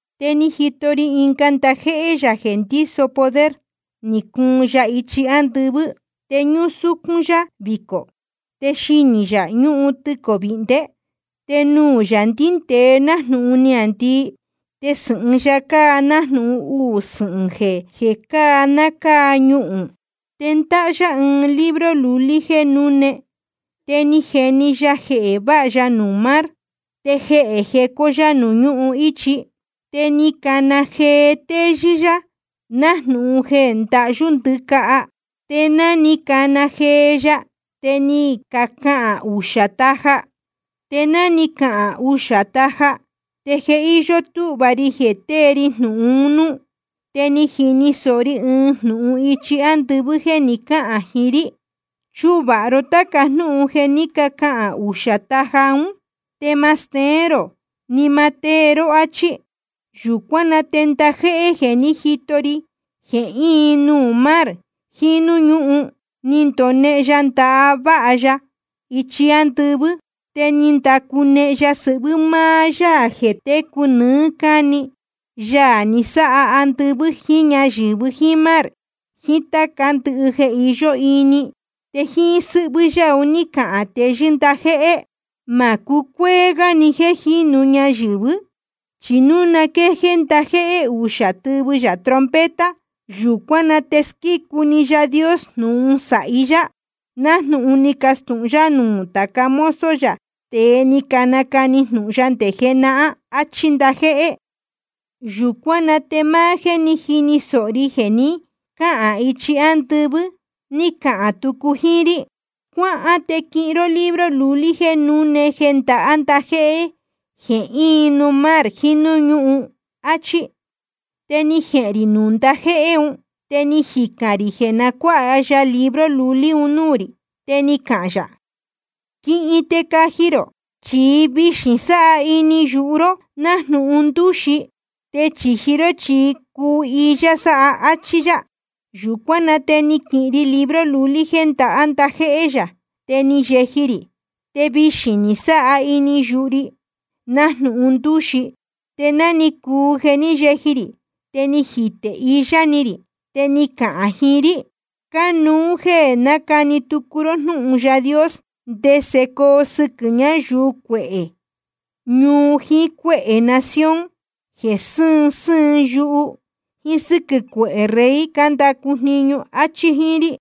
Te ni jito ri ɨnga ndajéhé yā jeē ndíso poder, ni cuun ya ichi ándɨvɨ́. Te ñúsúcún yá vicō, te xinī yā ñúhun tɨcō vēhndé. Te nuū yā ndíndēe nájnūhun niāndii, te sɨ̄hɨn ya cáa nájnūhun uū sɨhɨ̄n jeē cáa ná cáa ñuhūn. Te ndáhá yá ɨɨn libro lulí jéē núne. Te ni jeni ya jehē váha ya nuū mar, te jehē jecó yá nuū ñúhun íchi. Te ni cana jee téyɨ́ yá, nájnūhun jeē ndahyú ndɨcaha. Te ná ni cana jee ya, te ni cacahān uxā taja. Te ná ni cacahān uxā taja, te je íyó túhva ri jeē tée ri jnūhun un núú. Te ni jini sōho ri ɨɨn jnūhun ichi ándɨvɨ́ jeē ni cáhān jiín rí: Chuvāha ró táca jnúhun jeē ní cacahān uxā taja ún, te ma steén rō, ni ma tée ró, áchí. Yūcuán na te ndajéhé jeē ní jito ri jeē íin nuū mar jiín núū ñúhun, ni ndonehen ya ndaha váha ya ichi ándɨvɨ́. Te ni ndacunehen ya sɨhvɨ́ máá Yaā jeē técu nɨɨ́ cáni, Yaā ni sáha andɨvɨ́ jíín ñáyɨ̄vɨ jíín mar jiín táca ndɨhɨ jeē iyó ini. Te jíín sɨ́hvɨ́ yá un ní cahān teyɨ́ ndajéhé: Ma cucuéé gá jeē jínu ñayɨ̄vɨ́. Chi núu na quéjéé ndajéhé uxā tɨvɨ yā trompeta, yūcuán na te squícu‑ni Yaā Dios jnūhun sāhi yá, nájnūhun ni castūhun yá nuū tāca mozo yā, tēe ni canacani jnūhun ya nde jenahán, áchí ndajéhé. Yūcuán na te máá jéē ní jini sōho ri jeē ni cáhān ichi ándɨvɨ́, ni cahān tucu jíín rí: Cuáhán te quihin ró libro lulí jéē núne jeē ndahá ndajéhé jeē íin nuū mar jiín núū ñúhun, áchí. Te ni jehēn rī nuū ndajéhé un, te ni jicān rī jeē na cuáha ya libro lulí un núū rī. Te ni cahān yā: Quihin te caji rō. Chi vixī sáha ini yuhu ró nájnūhun ndūxi, te chīji ró chi cuhiyá sáha, áchí yá. Yūcuán na te ni quihin ri libro lulí jeē ndahá ndajéhé yā, te ni yeji rī. Te vixī ni sáha ini yuhu ri nájnūhun ndūxi. Te ná ni cuu ni yeji rī, te ni jitē iyá ni rī. Te ni cacahān jiín rí: Cánuú jéē nacani tucu ró jnúhun Yaā Dios, ndese coo sɨquɨ̄ ñayuu cuehē ñuu jiín cuéhē nación jeē sɨ́ɨn sɨ́ɨn yuhu, jíín sɨ́quɨ̄ cuehē rey cándacu jniñu, áchí jíín rí.